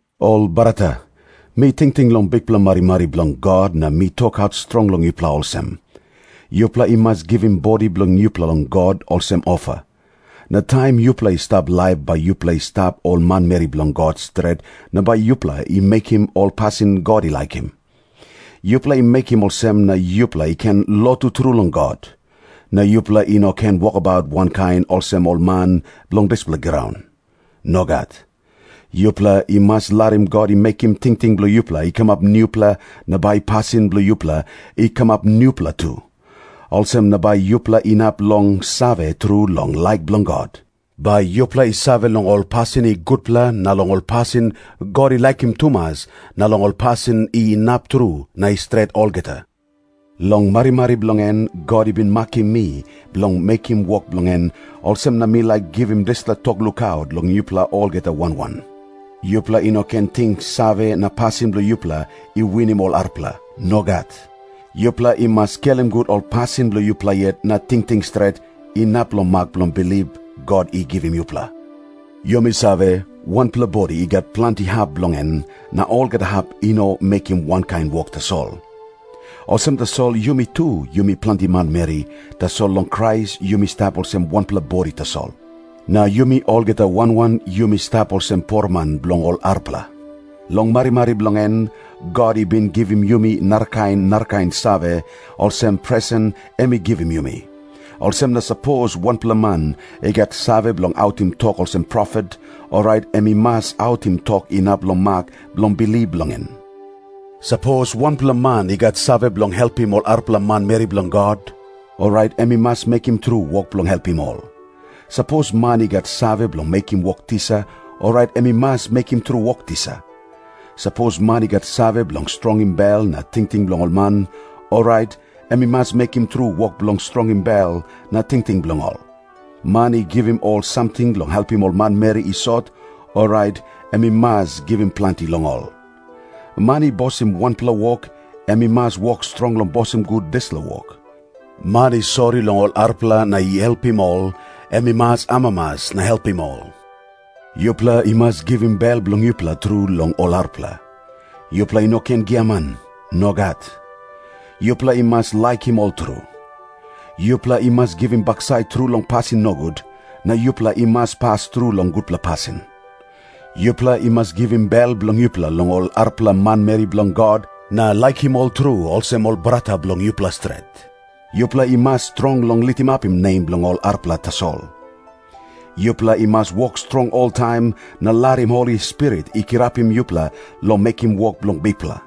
Ol brata, mi tingting long bikpela marimari bilong God na mi tokaut strong long yupela olsem. Yupela i mas givim bodi bilong yupela long God olsem ofa. Na taim yupela i stap laip bai yupela i stap ol manmeri bilong God stret na bai yupela i mekim ol pasin God i laikim. Yupela i mekim olsem na yupela i ken lotu tru long God. Na yupela i no ken wokabaut wankain olsem ol man bilong dispela graun. Nogat. Yupela i mas larim God i mekim tingting bilong yupela i kamap nupela na bai pasin bilong yupela i kamap nupela tu. Olsem na bai yupela inap long save tru long laik bilong God. Bai yupela i save long ol pasin i gutpela na long ol pasin God i laikim tumas na long ol pasin i inap tru na i stret olgeta. Long marimari bilong en God i bin makim mi bilong mekim wok bilong en, olsem na mi laik givim dispela tok lukaut long yupela olgeta wan wan. Yupela i no ken ting save na pasin bilong yupela i winim ol arapela. Nogat. Yupela i mas skelim gut ol pasin bilong yupela yet na tingting stret, inap long mak bilong bilip God i givim yupela. Yumi save, wanpela bodi i gat planti hap bilong en, na olgeta hap i no mekim wankain wok tasol. Olsem tasol yumi tu yumi planti manmeri, tasol long Krais yumi stap olsem wanpela bodi tasol. Na yumi olgeta wan wan yumi stap olsem poroman bilong ol arapela. Long marimari bilong en God i bin givim yumi narakain narakain save, olsem presen em i givim yumi. Olsem na sapos wanpela man i gat save bilong autim tok olsem profet, orait em i mas autim tok inap long mak bilong bilip bilong en. Sapos wanpela man i gat save bilong helpim ol arapela manmeri bilong God, orait em i mas mekim tru wok bilong helpim ol. Sapos man i gat save bilong mekim wok tisa, orait em i mas mekim tru wok tisa. Sapos man i gat save bilong strongim bel na tingting bilong ol man, orait em i mas mekim tru wok bilong strongim bel na tingting bilong ol. Man i givim ol samting long helpim ol manmeri i sot, orait em i mas givim planti long ol. Man i bosim wanpela wok, em i mas wok strong long bosim gut dispela wok. Man i sori long ol arapela na i helpim ol, em i mas amamas na helpim ol. Yupela i mas givim bel bilong yupela tru long ol arapela. Yupela i no ken giaman. Nogat. Yupela i mas laikim ol tru. Yupela i mas givim baksait tru long pasin nogut, na yupela i mas pas tru long gutpela pasin. Yupela i mas givim bel bilong yupela long ol arapela manmeri bilong God, na laikim ol tru olsem ol brata bilong yupela stret. Yupela i mas strong long litimapim nem bilong ol arapela tasol. Yupela i mas wok strong oltaim na larim Holi Spirit i kirapim yupela long mekim wok bilong Bikpela.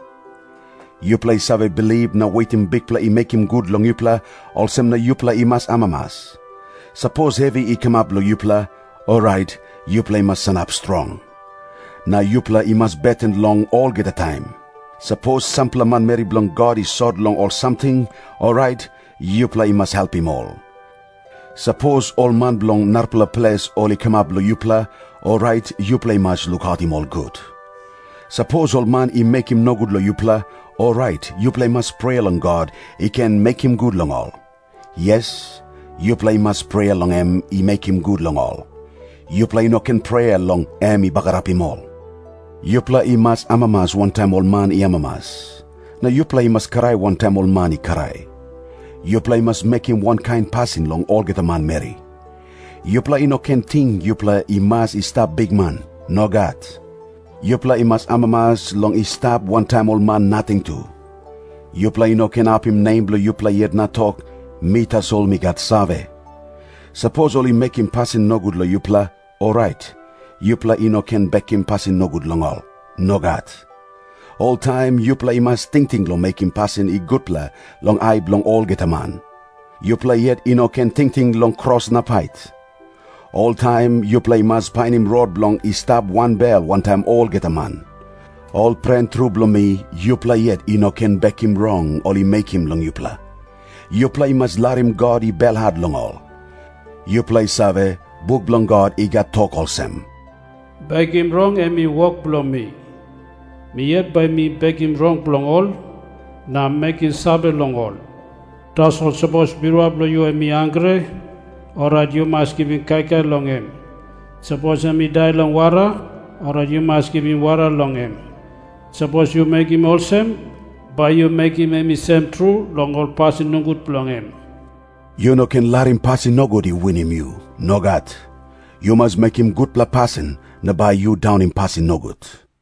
Yupela i save bilip na wetim Bikpela i mekim gut long yupela, olsem na yupela i mas amamas. Sapos hevi i kamap long yupela, orait yupela i mas sanap strong. Na yupela i mas beten long olgeta taim. Sapos sampela manmeri bilong God i sot long ol samting, orait yupela i mas helpim ol. Sapos ol man bilong narapela ples ol i kamap long yupela, orait yupela i mas lukautim ol gut. Sapos ol man i mekim nogut long yupela, orait yupela i mas prea long God i ken mekim gut long ol. Yes, yupela i mas prea long em i mekim gut long ol. Yupela i no ken prea long em i bagarapim ol. Yupela i mas amamas wantaim ol man i amamas. Na yupela i mas krai wantaim ol man i krai. Yupela i mas mekim wankain pasin long olgeta manmeri. Yupela i no ken ting yupela i mas i stap bikman. Nogat. Yupela i mas amamas long i stap wantaim ol man nating tu. Yupela i no ken apim nem bilong yupela yet na tok, “Mi tasol mi gat save.” Sapos ol i mekim pasin nogut long yupela, orait yupela i no ken bekim pasin nogut long ol. Nogat. Oltaim yupela i mas tingting long mekim pasin i gutpela long ai bilong olgeta man. Yupela yet i no ken tingting long kros na pait. Oltaim yupela i mas painim rot bilong i stap wanbel wantaim olgeta man. Ol pren tru bilong mi, yupela yet i no ken bekim rong ol i mekim long yupela. Yupela i mas larim God i belhat long ol. Yupela i save, buk bilong God i gat tok olsem, “Bekim rong, em i wok bilong mi. Mi yet bai mi bekim rong bilong ol na mekim save long ol. Tasol sapos birua bilong yu em i hangre, orait yu mas givim kaikai long em. Sapos em i dai long wara, orait yu mas givim wara long em. Sapos yu mekim olsem, bai yu mekim em i sem tru long ol pasin nogut bilong em.” Yu no ken larim pasin nogut i winim yu. Nogat. Yu mas mekim gutpela pasin na bai yu daunim pasin nogut.